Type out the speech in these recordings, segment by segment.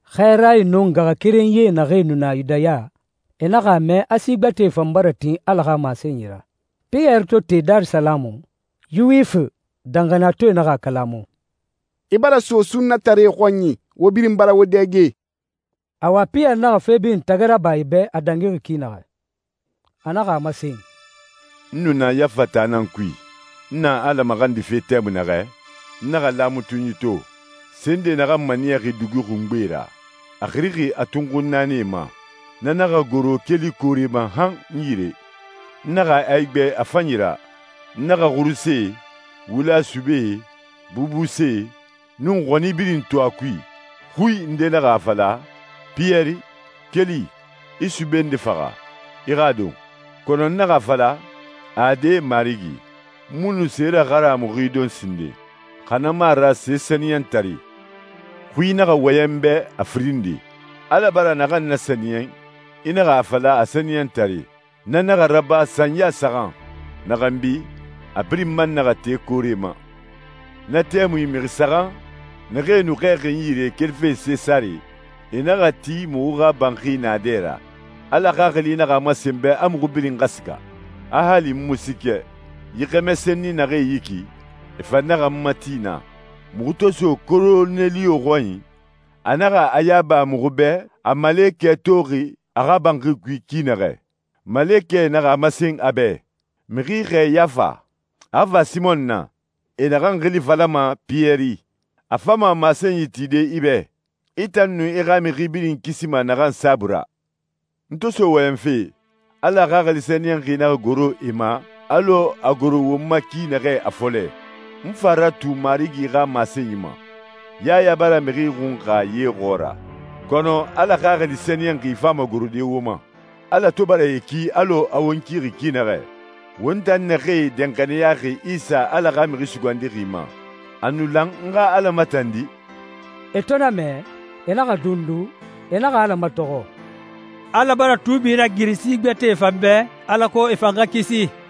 Xɛɛrae nun ngaxakerenyie naxee nu na Yudaya, e naxa a mɛ a si gbɛtɛe fan bara tin Ala xa masenyi ra. Piyɛri to te Darisalamu, Yuwifi danxaniyatɔɛe naxa a kalamu, «I bara so sunnataree xɔnyi, wo birin bara wo dɛge!» Awa Piyɛri naxa fe birin tagi raba e bɛ a dangixi ki naxɛ. A naxa a masen, «N nu na Yafa taa nan kui. N na Ala maxandife tɛmui naxɛ, n naxa laamatunyi to. Se nde naxan maniyaxi dugi xungbe ra, a xirixi a tunxun naanie ma, na naxa goro keli koore ma han n yire. N naxa a igbɛ a fanyi ra. N naxa xurusee, wula subee, bubusee, nun xɔni birin to a kui. Xui nde naxa a fala, ‹Piyɛri, keli, i sube nde faxa, i xa a don.› Kɔnɔ n naxa a fala, ‹Ade, Marigi. N mu nu se raharamuxi don sinden, xa na mu a ra se sɛniyɛntare.› Xui naxa wɔyɛn n bɛ a firin nde, ‹Ala bara naxan nasɛniyɛn i naxa a fala a sɛniyɛntare.› Na naxa raba sanya saxan. Na xanbi, a birin man naxa te koore ma.» «Na tɛmui mixi saxan, naxee nu xɛɛxi n yire kelife Sesare, e naxa ti muxu xa banxi naadɛ ra. Ala Xaxili naxa a masen n bɛ a muxu birin xa siga, a hali n mu siikɛ. Yi xɛmɛ senni naxee yi ki, e fan naxa n mati naa. Muxu to so Koroneliyo xɔnyi, a naxa a yaba muxu bɛ a malekɛ toxi a xa banxi kui ki naxɛ. Malekɛ naxa a masen a bɛ, ‹Mixi xɛɛ Yafa, a xa fa Simɔn na, e naxan xili falama Piyɛri. A fama masenyi tide i bɛ, i tan nun i xa mixi birin kisima naxan saabui ra.›» «N to so wɔyɛnfe, Ala Xaxili Sɛniyɛnxi naxa goro e ma alɔ a goro won ma ki naxɛ a fɔlɛ. N fa ratu Marigi xa masenyi ma, ‹Yaya bara mixi xunxa ye xɔɔra, kɔnɔ Ala Xaxili Sɛniyɛnxi fama gorode wo ma.› Ala to bara e ki alɔ a won kixi ki naxɛ, won tan naxee danxaniyaxi Isa Ala xa Mixi Sugandixi ma, a nu lan n xa Ala matandi?» E to na mɛ, e naxa dundu, e naxa Ala matɔxɔ, «Ala bara tuubi ragiri si gbɛtɛe fan bɛ, alako e fan xa kisi.»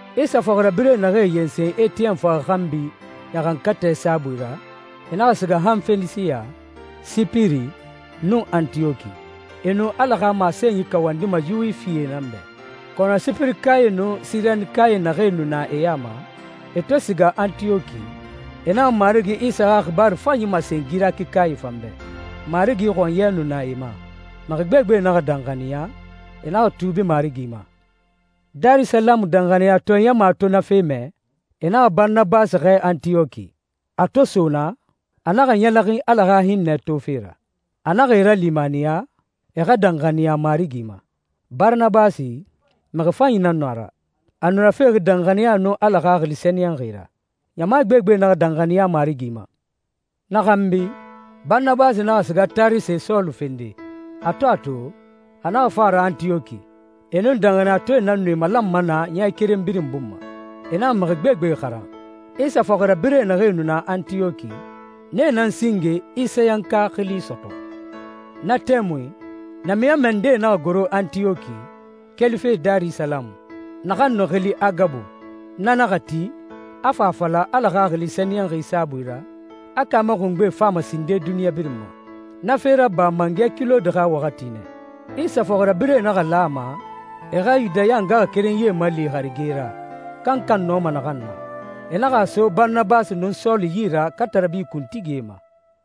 Isa fɔxirabirɛ naxee yensen Etiyɛn faxa xanbi ɲaxankatɛ saabui ra, e naxa siga han Fenisiya, Sipiri, nun Antiyɔki. E nu Ala xa masenyi kawandima Yuwifie nan bɛ. Kɔnɔ Sipirikae nun Sirenikae naxee nu na e ya ma, e to siga Antiyɔki, e naxa Marigi Isa xa xibaaru fanyi masen Girɛkikae fan bɛ. Marigi xɔnyɛ nu na e ma. Mixi gbegbe naxa danxaniya, e naxa tuubi Marigi ma. Darisalamu danxaniyatɔɛ ɲama to na fe mɛ, e naxa Baranabasi xɛɛ Antiyɔki. A to so naa, a naxa ɲɛlɛxin Ala xa hinnɛ tofe ra. A naxa e ralimaniya, e xa danxaniya Marigi ma. Baranabasi, mixi fanyi nan nu a ra. A nu rafexi danxaniya nun Ala Xaxili Sɛniyɛnxi ra. Ɲama gbegbe naxa danxaniya Marigi ma. Na xanbi, Baranabasi naxa siga Tarise Sɔlu fende. A to a to, a naxa fa a ra Antiyɔki. E nun danxaniyatɔɛe nan nu e malanma naa ɲɛ keren birin bun ma. E naxa mixi gbegbe xaran. Isa fɔxirabirɛ naxee nu na Antiyɔki, nee nan singe «Isayanka» xili sɔtɔ. Na tɛmui, namiɲɔnmɛ ndee naxa goro Antiyɔki, kelife Darisalamu. Naxan nu xili Agabu, na naxa ti, a fa a fala Ala Xaxili Sɛniyɛnxi saabui ra, a kaamɛ xungbe fama sinde duniɲa birin ma. Na fe raba mangɛ Kilɔdi xa waxati nɛ. Isa fɔxirabirɛe naxa lan a ma e xa Yudaya ngaxakerenyie mali harige ra, kankan nɔma naxan na. E naxa a so Baranabasi nun Sɔlu yi ra katarabi kuntigie ma.